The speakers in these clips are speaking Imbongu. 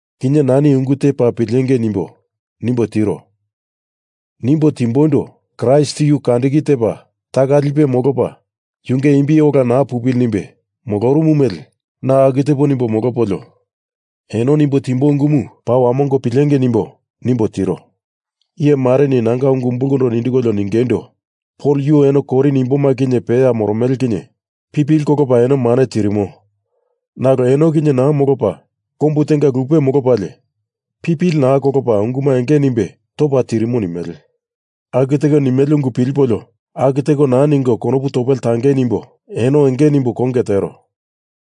Kinye nani ungu te paa pilengei nimbo, nimbo tiro. Nimbo timboindo Kraist yu kandiki tepa taka lipe molopa yunge imbi ola naa molopili nimbe molorumu mele na aku tepo nimbo molopolio, eno nimbo timboi ungumu paa wamongo pilengei nimbo, nimbo tiro. Iye mareni nanga ungu umbulkondo nindikolio ningeindo, Pol yu eno Korin imboma kinye peya moromele kinye pipili kolopa eno mane tirimo, nalo eno kinye naa molopa kombu tenga lupe molopalie, pipili naa kolopa unguma enge nimbe topa tirimo nimele. Aku teko nimele ungu pilipolio aku teko naa ningo konopu topele tangei nimbo, eno enge nimbo konge tero.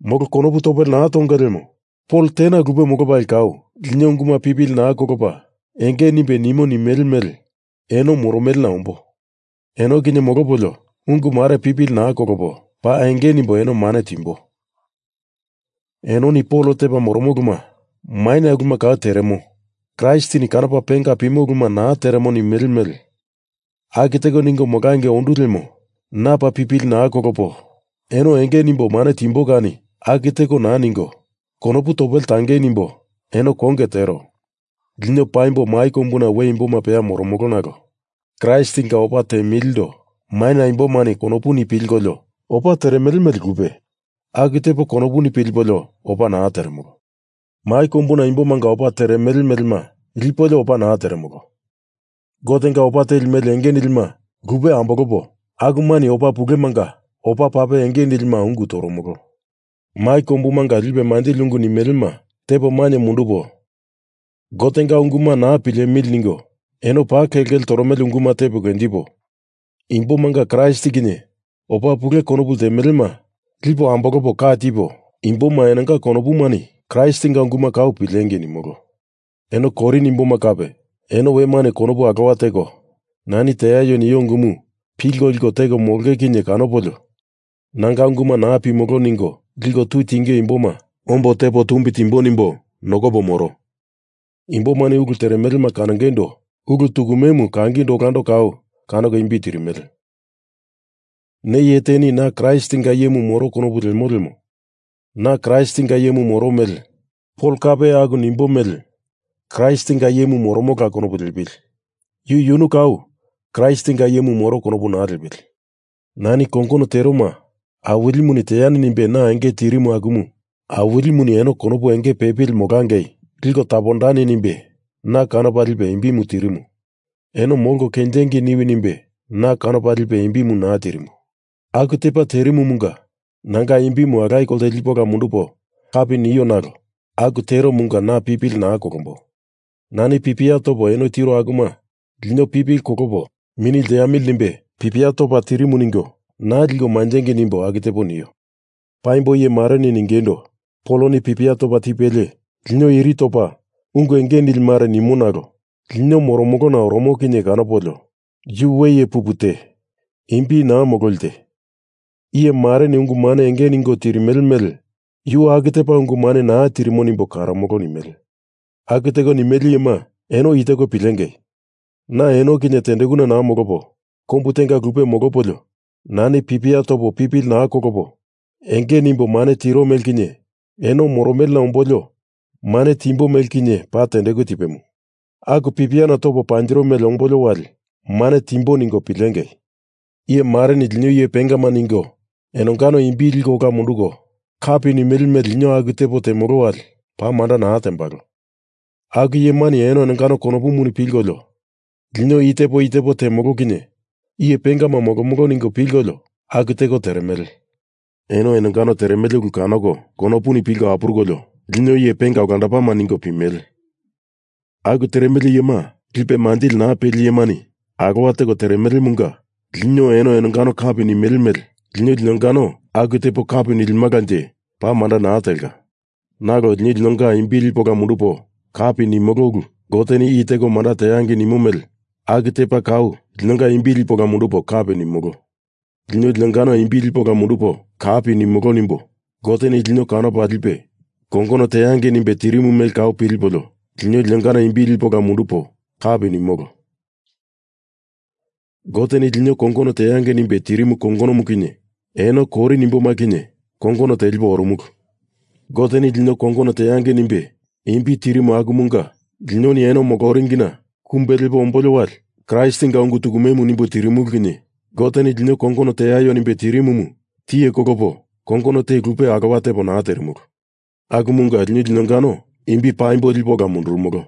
Molo konopu topele naa tonge lemo Pol tena lupe molopalie kau lino unguma pipili naa kolopa enge nimbe nimo nimele mele eno moromelena ombo. Eno kinye molopolio ungu mare pipili naa kolopo paa enge nimbo eno mane timbo. Enoni Pol tepa moromo uluma maina uluma kau teremo, Kraistini kanopa penga pimo uluma naa teremo nimele mele aku teko ningo molangei ondu lemo na paa pipili naa kolopo eno enge nimbo mane timbo kani aku teko naa ningo, konopu topele tangei nimbo, eno konge tero. Lino paimbo mai kombuna we imboma peya moromolo nalo Kraistinga opa temilindo maina imbomani konopuni pilkolio opa teremele mele lupe, aku tepo konopuni pilipolio opa naa teremolo. Lino opa temilindo mai kombuna imbomanga opa teremele melema lipolio opa naa teremolo. Gotenga opa teli mele enge nilima lupe ambolopo, akumani opa pulemanga opa pape enge nilima ungu toromolo. Mai kombumunga lipe manjili ungu nimelema tepo mainye mundupo, Gotenga unguma naa pilemili ningo eno paa kelkele toromele unguma tepo kenjipo, imbomanga Kraist kinye opa pule konopu ltemelema lipo ambolopo ka tipo, imboma enonga konopumani Kraistinga unguma kau pilengei nimolo. Eno Korin imboma kape, eno wemani konopu alowa teko nani teaio nio ungumu pilko liko teko molonge kinye kanopolio nanga unguma naa pimolo ningo liko tui tinge imboma ombo tepo tumbi timbo nimbo nokopo moro. Imbomani ulu teremelema kanongeindo ulu tukumemu kangindo olando kau kanoko imbi tirimele. Ne iye teni na Kraistinga iyemu moro konopu lemo lemo na Kraistinga iyemu moro mele Pol kape aku nimbo mele Kraistinga iyemu moromola konopu liepili. Yu yunu kau Kraistinga iyemu moro konopu naa liepili. Nani kongono teroma Awilimuni teani nimbe na enge tirimu akumu Awilimuni eno konopu enge pepili molangei liko tapondani nimbe na kanopa lipe imbimu tirimu. Eno molko kenjengei niwi nimbe na kanopa lipe imbimu naa tirimu. Aku tepa terimumunga nanga imbimu alaye kolte lipo ola mundupo kapi nio nalo aku teromunga na pipili naa kolombo. Nani pipia topo eno tiro akuma lino pipili kolopo mini lteamili nimbe pipia topa tirimu ningo naa liko manjengei nimbo aku tepo nio. Paimbo iye mareni ningeindo, Poloni pipia topa tipelie lino iri topa ungu enge nili mare nimo nalo lino moromolona oromo kinye kanopolio yu we iye pupu te. Imbi naa mololi te. Iye mareni ungu mane enge ningo tirimele mele yu aku tepa ungu mane naa tirimo nimbo karomolo nimele. Aku teko nimele iyema eno i teko pilengei, na eno kinye tendekuna naa molopo, kombu tenga lupe molopolio nani pipia topo pipili naa kolopo enge nimbo mane tiro mele kinye, eno moromelena ombolio mane timbo mele kinye, paa tendeku tipemu. Aku pipiana topo panjiro mele ombolio wali mane timbo ningo pilengei! Iye mareni lino iye pengama ningo enongano imbi liko ola munduko kapi nimele mele lino aku tepo temolo wali paa manda naa tembalo. Aku iyemani eno enongano konopuni pilkolio lino i tepo i tepo temolo kinye iye pengama molomolo ningo pilkolio aku teko teremele. Eno enongano teremele ulu kanoko konopuni pilko apurukolio lino iye penga olandopama ningo pimele. Aku teremele iyema lipe manjili naa peli iyemani alowa teko teremelemunga lino eno enongano kapi nimele mele lino linongano aku tepo kapi nilimalanje paa manda naa telka. Nalo lino linonga imbi lipo ola mundupo kapi nimolo ulu Goteni i teko manda teangei nimo mele aku tepa kau linonga imbi lipo ola mundupo kapi nimolo. Lino linongano imbi lipo ola mundupo kapi nimolo nimbo Goteni lino kanopa lipe kongono teangei nimbe tirimu mele kau pilipolio lino linongano imbi lipo ola mundupo kapi nimolo. Goteni lino kongono teangei nimbe tirimu kongonomu kinye eno Korin imboma kinye kongono telipo orumulu. Goteni lino kongono teangei nimbe imbi tirimu akumunga linoni eno moloringina kumbe lepo ombolio wali Kraistinga ungu tukumemu nimbo tirimulu kinye Goteni lino kongono teaio nimbe tirimumu tiye kolopo kongono te lupe alowa tepo naa terimulu. Akumunga lino linongano imbi paimbo lipo ola mundurumolo.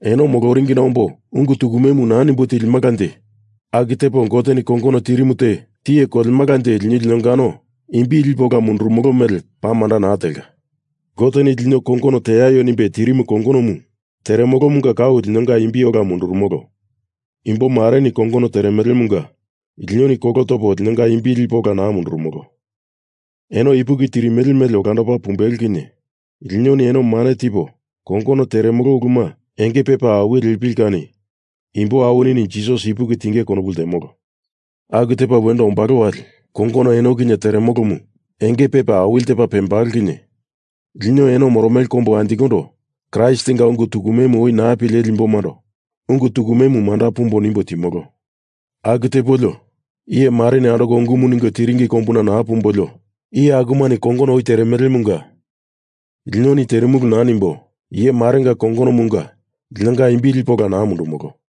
Eno moloringina ombo ungu tukumemu naa nimbo tilimalanje aku tepo Goteni kongono tirimu te tiye kolemalanje lino linongano imbi lipo ola mundurumolo mele paa manda naa telka. Goteni lino kongono teaio nimbe tirimu kongonomu teremolomunga kau linonga imbi ola mundurumolo. Imbo mareni kongono teremelemunga linoni kolo topo linonga imbi lipo ola naa mundurumolo. Eno ipuki tirimele mele olandopa pumbelo kinye linoni eno mane tipo kongono teremolo uluma enge pepa awili lepili kani imbo awinini Jisas ipuki tinge konopu ltemolo. Aku tepa wendo ombalo wali kongono eno kinye teremolomu enge pepa awili tepa pembalo kinye lino eno moromele kombu anjikondo Kraistinga ungu tukume oi naa pileli imbomando ungu tukume manda pumbo nimbo timolo. Aku tepolio iye mareni andoko ungumu ningo tiringi kombuna naa pumbolio iye akumani kongono oi teremelemunga linoni terimulu naa nimbo, iye marenga kongonomunga linonga imbi lipo ola naa mundumolo.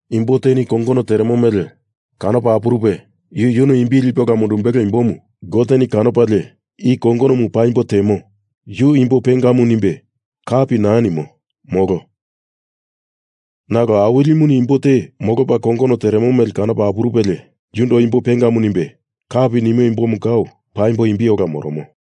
Imbo teni kongono teremo mele kanopa apurupe yu yunu imbimu lipe ola mundumbelo imbomu Goteni kanopalie i kongonomu paimbo temo, yu imbo pengamu nimbe kapi naa nimo, molo. Nalo Awilimuni imbo te molopa kongono teremo mele kanopa apurupelie yundo imbo pengamu nimbe kapi nimo imbomu kau paimbo imbi ola moromo.